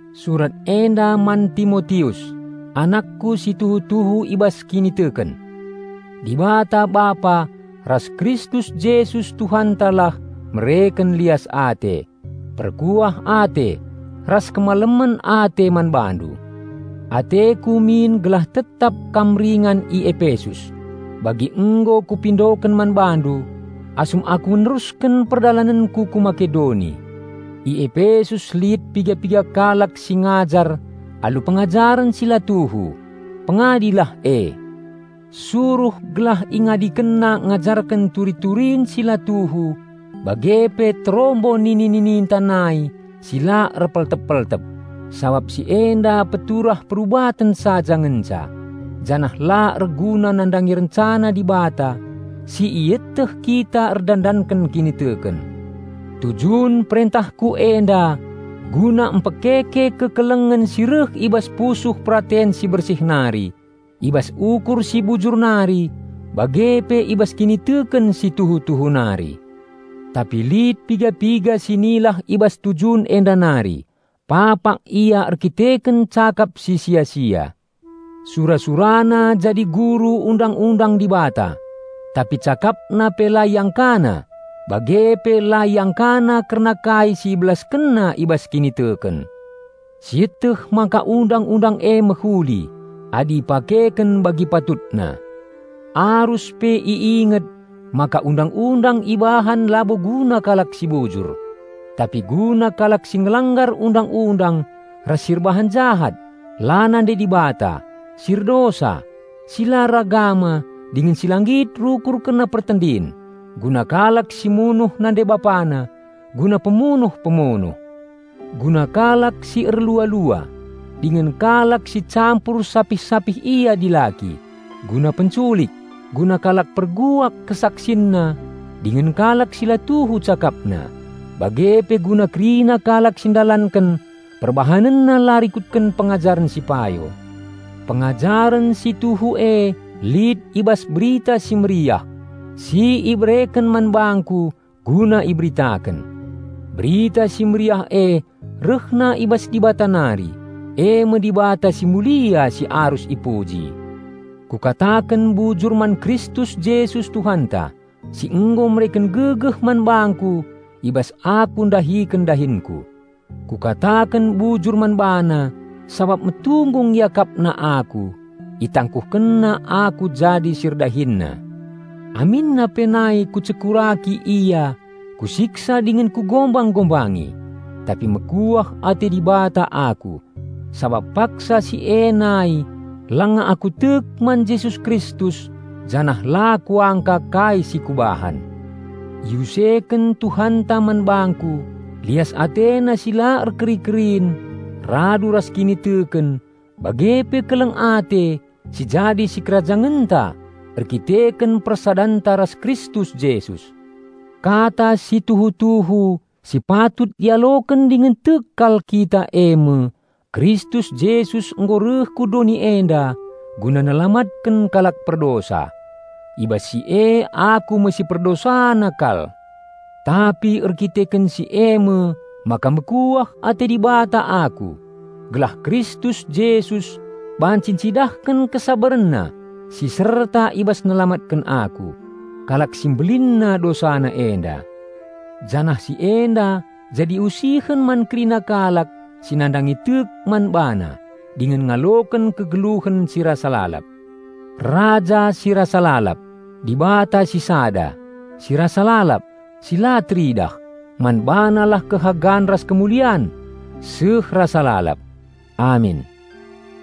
Surat enda man Timotius, anakku si tuhu-tuhu i bas kiniteken. Dibata Bapa ras Kristus Jesus Tuhantalah mereken lias ate, perkuah ate, ras kemalemen ate man bandu. Ateku min gelah tetap kam ringan i Epesus, bagi nggo kupindoken man bandu asum aku nerusken perdalanenku ku Makedoni. I Epesus lit piga-piga kalak si ngajar alu pengajaren si la tuhu. Pengadilah e. Suruh gelah ingadikenna ngajarken turi-turin si la tuhu bage pe terombo nini-nininta nai si la erpeltep-peltep, sabap si enda peturah perubaten saja ngenca janah la erguna nandangi rencana Dibata si ieteh kita erdandan kiniteken. Tujun perentahku enda guna mpekeke kekelengen si reh i bas pusuh peraten si bersih nari, i bas ukur si bujur nari, bage pe i bas kiniteken si tuhu-tuhu nari. Tapi lit piga-piga si nilah i bas tujun enda nari, papak ia erkiteken cakap si sia-sia. Sura-surana jadi guru Undang-undang Dibata, tapi cakapna pe la iangkana bage pe la iangkana kerna kai si ibelaskenna i bas kiniteken. Sieteh maka Undang-undang e mehuli, adi ipakeken bagi patutna. Arus pe i inget maka Undang-undang ibahan labo guna kalak si bujur, tapi guna kalak si ngelanggar undang-undang ras si erbahan jahat, la nandai Dibata, si erdosa, si la eragama dingen si la nggit rukur kerna pertendin, guna kalak si munuh nande-bapana, guna pemunuh-pemunuh, guna kalak si erlua-lua, dingen kalak si campur sapih-sapih ia dilaki, guna penculik, guna kalak perbual kesaksinna dingen kalak si la tuhu cakapna, bage pe guna kerina kalak si ndalanken perbahanenna la rikutken pengajaren si payo. Pengajaren si tuhu e lit i bas Berita Si Mehuli si ibereken man bangku guna iberitaken. Berita Si Mehuli e rehna i bas Dibata nari, e me Dibata si mulia si arus ipuji. Kukataken bujur man Kristus Jesus Tuhanta, si nggo mereken gegeh man bangku i bas aku ndahiken dahinku. Kukataken bujur man BaNa sabap metunggung IakapNa aku, ItangkuhkenNa aku jadi si ErdahinNa, aminna pe nai kucekuraki Ia kusiksa dingen kugombang-gombangi. Tapi mekuah ate Dibata aku, sabap paksa si e nai langa aku tek man Jesus Kristus janah la kuangka kai si kubahan. Iuseken Tuhanta man bangku lias AteNa si la erkeri-kerin radu ras kiniteken bage pe keleng ate si jadi sikerajangenta erdandanken persadanta ras Kristus Jesus. Kata si tuhu-tuhu si patut ialoken dingen tek kal kita e me, "Kristus Jesus nggo reh ku doni enda guna nelamatken kalak perdosa." I bas si e aku me si perdosana kal. Tapi erdandanken si e me maka mekuah ate Dibata aku, gelah Kristus Jesus banci ncidahken KesabarenNa si serta i bas nelamatken aku, kalak si mbelinna dosana enda. Janah si enda jadi usihen man kerina kalak si nandangi tek man BaNa dingen ngaloken kegeluhen si rasa lalap. Raja si rasa lalap, Dibata si sada, si rasa lalap, si la teridah, man BaNalah kehagan ras kemulian seh rasa lalap. Amin.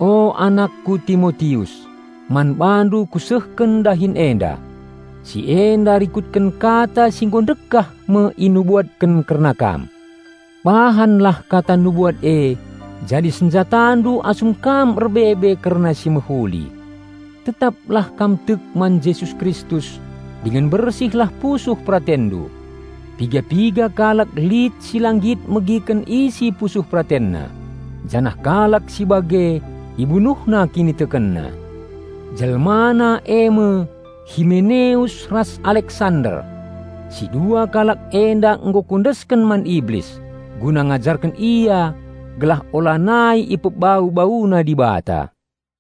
O anakku Timotius, man bandu kusehken dahin enda. Si enda rikutken kata si nggo ndekah me inubuatken kerna kam. Bahanlah kata nubuat e jadi senjatandu asum kam erbebe kerna si mehuli. Tetaplah kam tek man Jesus Kristus dingen bersihlah pusuh peratenndu. Piga-piga kalak lit si la nggit megiken isi pusuh PeratenNa; janah kalak si bage ibunuhna kinitekenna. Jelmana e me Himeneus ras Aleksander. Si dua kalak enda nggo kuendesken man Iblis, guna ngajarken ia gelah ulanai ipebau-bauna Dibata.